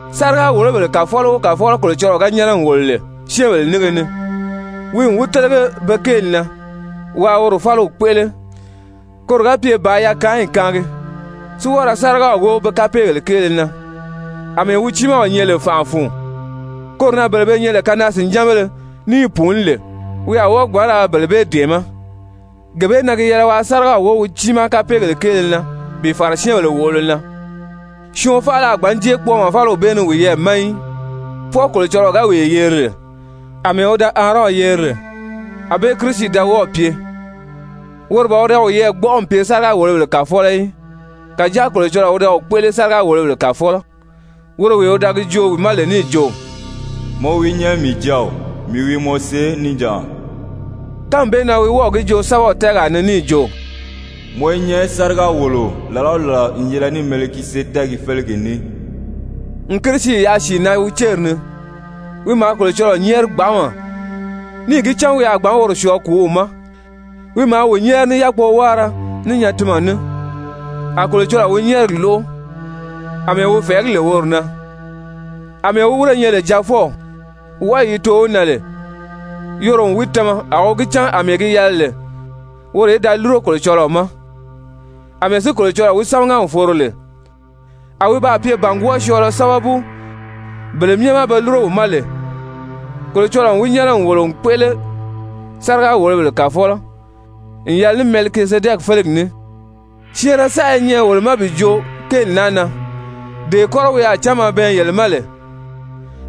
Sáriga-wòlobèle kàfɔlɔ o kàfɔlɔ Kolocɔlɔɔ ga nyɛ́nɛ n wòlo lè syɛ́ɛnbèle nínge ni, wi n wi télege be kéeli na waa woro fáliw kpéʔele, koro ga pye bàā yakaanyi kaangi, si wɔ́ɔ ra sárigaw wóo be kapeegèle kéele na. Amɛɛ wi tiimaw nyɛ lè fànʔa fun, koro na bele be nyɛ lè kanaa-sìnjánbéle ní i pùuní lè, wi a wɔ́ɔ gbǎn ra bele bee dɛ̀ɛmɛ́. Gee bee na wi yɛlɛ waa sárigaw wóo wi tiimaa kapeegèle kéele na bi fàra syɛ́ɛnbèle wòʔolo na. Syɔɔn faala a gbǎn jée kpɔɔmɔ fáliw bee ni wiyɛɛ ma í, fwɔɔ Kolocɔlɔɔ ga wee yeri lè, àmɛɛ wi da Aarɔn yeri lè. Anbée Kirisi da wɔ́ɔ̀ pye, woro ban wi da wiyɛɛ gbɔ́ʔɔ n pye sáriga-wòlobèle kàfɔlɔ í, kàjáa Kolocɔlɔɔ wi da wi kpéʔele sáriga-wòlobèle kàfɔlɔ, woro wee wi da gi joo wi ma lè níì jo: «Mɔ wi nyɛ mii Jáaw, mii wi mɔ see níjanʔa.» Kánmi bee na wi wɔ́ɔ̀ gi joo sɛ́bɛw tɛ́ɛgaa ni níì jo: «Mɔ i nyɛ sáriga-wòloo làla o làla n yɛlɛ ní Mɛlikizedɛki félegi ní.» N Kirisi yaʔa sìi na wi céri ni, wi maa Kolocɔlɔɔ nyɛ́ɛri gbanʔama, níì gi cán wi a gbǎn woro syɔɔ kùúw ma. Wi maa wi nyɛ́ɛri ní yákpowáara, ní nyatinmɛ ní, a Kolocɔlɔɔ wi nyɛ́ɛrigi lóʔo àmɛɛ wi fɛ̀ɛgí lè woro na. Amɛɛ wi wírē nyɛ lè Jaafɔw, wɔʔɔyi yi too wi na lè, yoro n wi tama a wi gi cán àmɛɛ gi yɛlɛ lè woro í da lúro Kolocɔlɔɔ ma. Amɛɛ si Kolocɔlɔɔ wi sámaga n foro lè, a wi baa pye bàngwɔɔ syɔɔlɔ sábabu bele myɛ ma be lúro wi ma lè. Kolocɔlɔɔ n wi nyɛ́nɛ n wòlo n kpéʔele sáriga-wòlobèle kàfɔlɔ n yɛlɛ ní Mɛlikizedɛki félegi ní. Syɛɛnrɛ saʔa i nyɛ wolo ma bi joo kéeli naa na, dee kɔ́rɔ wi a cánma bɛɛn yele ma lè,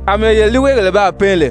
àmɛɛ yele líiweegèle baa pɛɛn lè.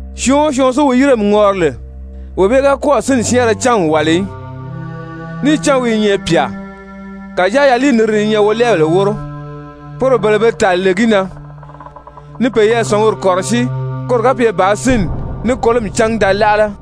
Syɔɔn o syɔɔn si wi yíremi ŋɔri lè, wee bee ga kɔ́ɔ̀ sínni syɛ́ɛnrɛ cán n wàli í, níì cán wi i nyɛ pyà. Kàjáa yaliiniriri i nyɛ wolɛɛbèle wóro, poro bele be tàli lè gi na ni peyɛɛ sɔ̀nguri kɔ̀rɔsíi koro ga pye bàā sínni ní kolomi cángi da láʔala.